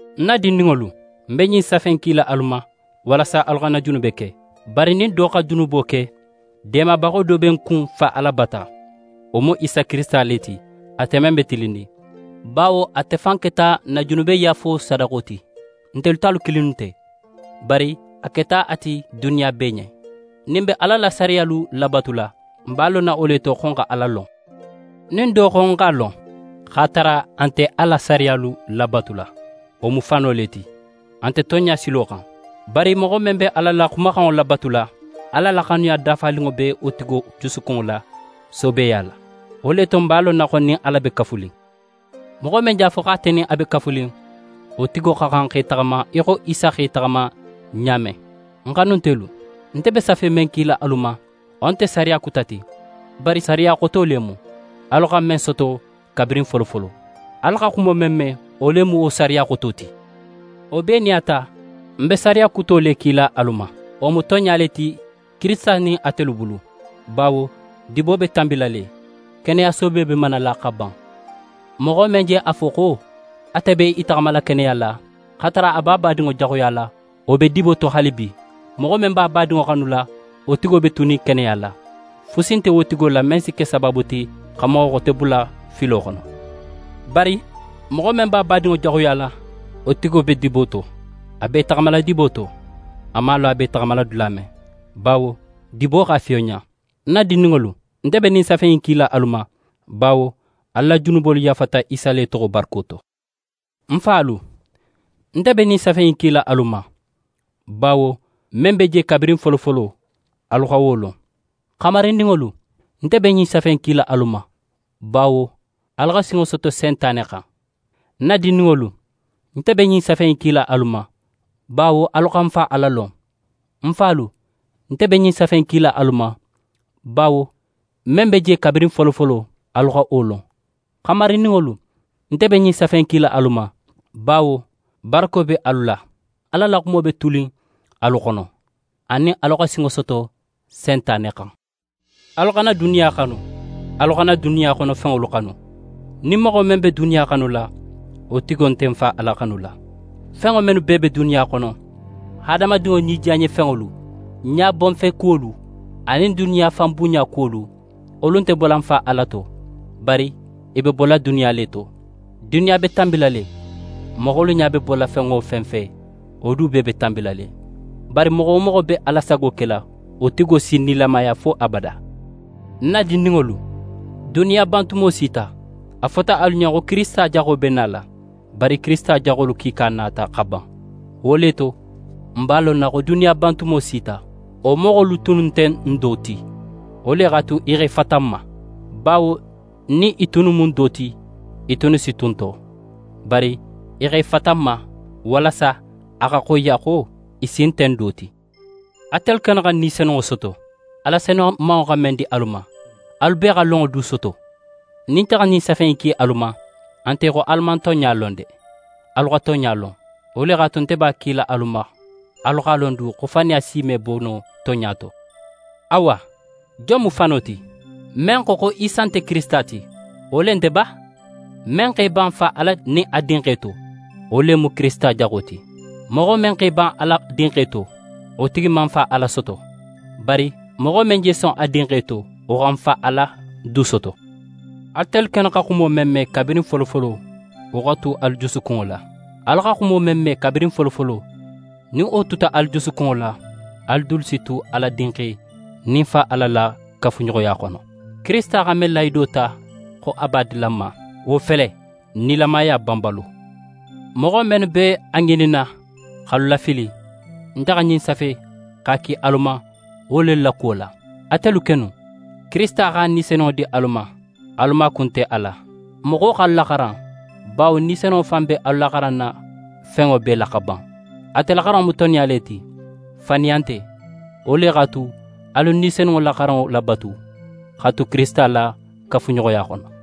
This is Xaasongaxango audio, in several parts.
Ń na dindinŋolu, ń be ɲin safe in kila alu ma walasa alu xana junube ke. Bari nin do xa junubo ke, deemabaxo do be n kun Fa Ala bata: Wo mu Isa Kirisita le ti, ate men be tilinnin. Bawo ate fan keta n na junubeyaafo sadaxo ti. Ntelu talu kilinnu nte, bari a keta a ti duniya bee ɲen. Nin n be Ala la sariyalu labatula, n b'a lonna wo le to xo n xa Ala lon. Nin do xo: «Ń x'a lon» x'a tara a nte a la sariyalu labatula, wo mu fano le ti, a nte tonɲa silo xan. Bari moxo men be a la xumaxanŋo labatula, Ala la xanuya dafaninŋo be wo tigo jusukunŋo la soobeya la. Wo le to, n b'a lonna xo n nin Ala be kafunin. Moxo men je a fo xo ate nin a be kafunin, wo tigo xa xan xa í taxama í xo Isa xa í taxama ɲa men. Ń xanuntelu, nte be safe men kila alu ma, wo nte sariya kuta ti, bari sariya xoto le mu, alu xa men soto kabirin folofolo. Alu xa xumo men me, wo le mu wo sariya xoto ti. Wo bee nin a ta, ń be sariya kuto le kila alu ma. Wo mu tonɲa le ti, Kirisita nin atelu dulu bulu; bawo dibo be tanbila le, keneya soobe be manala xa ban. Moxo men je a fo xo ate be í taxamala keneya la, x'a tara a be a badinŋo jaxuyala, wo be dibo to haalibi. Moxo men be a badinŋo xanula, wo tigo be tunin keneya la. Fusi nte wo tigo la men si ke sabaabu ti xa moxo xote bula filo xono. Bari moxo men be a badinŋo jaxuyala, wo tigo be dibo to, a be í taxamala dibo to, a man a lon a be taxala dula men, bawo dibo x'a fiyonɲa. Ń na dindinŋolu, nte be ɲin safe in kila alu ma, bawo alu la junubolu yaafata Isa le toxo barako to. Ń falu, nte be ɲin safe in kila alu ma, bawo men be je kabirin folofolo, alu xa wo lon. Xamarindinŋolu, nte be ɲin safe in kila alu ma, bawo alu xa sinŋo soto Sentane xan. Ń na dindinŋolu, nte be ɲin safe in kila alu ma, bawo alu xa n Fa Ala lon. Ń falu, nte be ɲin safe in kila alu ma, bawo men be je kabirin folofolo, alu xa wo lon. Xamarindinŋolu, nte be ɲin safe in kila alu ma, bawo barako be alu la, Ala la xumo be tunin alu xono, anin alu xa sinŋo soto Sentane xan. Alu xana duniya xanu, alu xana duniya xono fenŋolu xanu. Nin moxo men be duniya xanula, wo tigo nte n Fa Ala xanula. Fenŋo mennu bee be duniya xono: Hadamadinŋo nidiyanɲefenŋolu, ɲabonfekuwolu anin duniya fanbunɲa kuwolu, wolu nte bola Fa Ala to, bari i be bola duniya le to. Duniya be tanbila le, moxolu ɲa be bola fen wo fen fe, wo du bee be tanbila le, bari moxo wo moxo be Ala sago kela, wo tigo si nilamaya fo abada. Ń na dindinŋolu, duniya bantumo sita. A fota alu ɲen xo Kirisita Jaxo be nala, bari Kirisita jaxolu kiika nata xa ban. Wo le to, n b'a lonna xo duniya bantumo sita. Wo moxolu tunnu nte n do ti, wo le x'a tu i x'e fata n ma, bawo nin i tunnu mu n do ti, i tunnu si tu n to. Bari i x'e fata n ma walasa a xa xoyiya xo i si nte n do ti. Atelu kennu xa Ni Senunŋo soto, Ala senumanŋo xa men di alu ma. Alu bee xa lonŋo du soto. Nin nte xa ɲin safe in ki alu ma, a nte xo alu man tonɲa lon de! Alu xa tonɲa lon, wo le x'a tu, nte b'a kila alu ma, alu x'a lon du xo faniya si me bo no tonɲa to. Awa, jon mu fano ti? Men xo xo Isa nte Kirisita ti, wo le nte ba? Men x'é ban Fa Ala nin a Dinxe to, wo le mu Kirisita Jaxo ti. Moxo men x'é ban Ala Dinxe to, wo tigi man n Fa Ala soto. Bari moxo men je son a Dinxe to, wo xa n Fa Ala du soto. Atelu kennu xa xumo men me kabirin folofolo, wo xa tu alu jusukunŋo la. Alu xa xumo men me kabirin folofolo nin wo tuta alu jusukunŋo la, alu dulu si tu Ala Dinxe nin n Fa Ala la kafuɲoxoya xono. Kirisita xa men lahido ta xo a b'a dila n ma, wo fele: Nilamaya banbalo. Moxo mennu be a ŋininna x'alu lafili, nte xa ɲin safe, x'a ki alu ma wo lelu la kuwo la. Atelu kennu, Kirisita x'a Ni Senunŋo di alu ma. Alu maaku nte a la, moxo x'alu laxaran, bawo Ni Senunŋo fan be alu laxaranna fenŋo bee la xa ban. Ate la xaranŋo mu tonɲa le ti, faniya nte. Wo le x'a tu, alu Ni Senunŋo la xaranŋo labatu, xa tu Kirisita la kafuɲoxoya xono.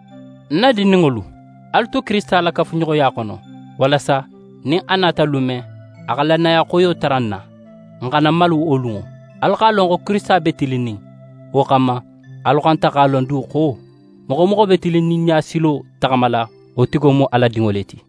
Ń na dindinŋolu, alu tu Kirisita la kafuɲoxoya xono, walasa nin a nata lun men, a xa lannaya xoyo tara n na, n xana malu wo lunŋo. Alu x'a lon xo Kirisita be tilinnin. Wo xanma, alu xanta x'a lon du xo moxo wo moxo be tilinninɲa silo taxamala, wo tigo mu Ala dinŋo le ti.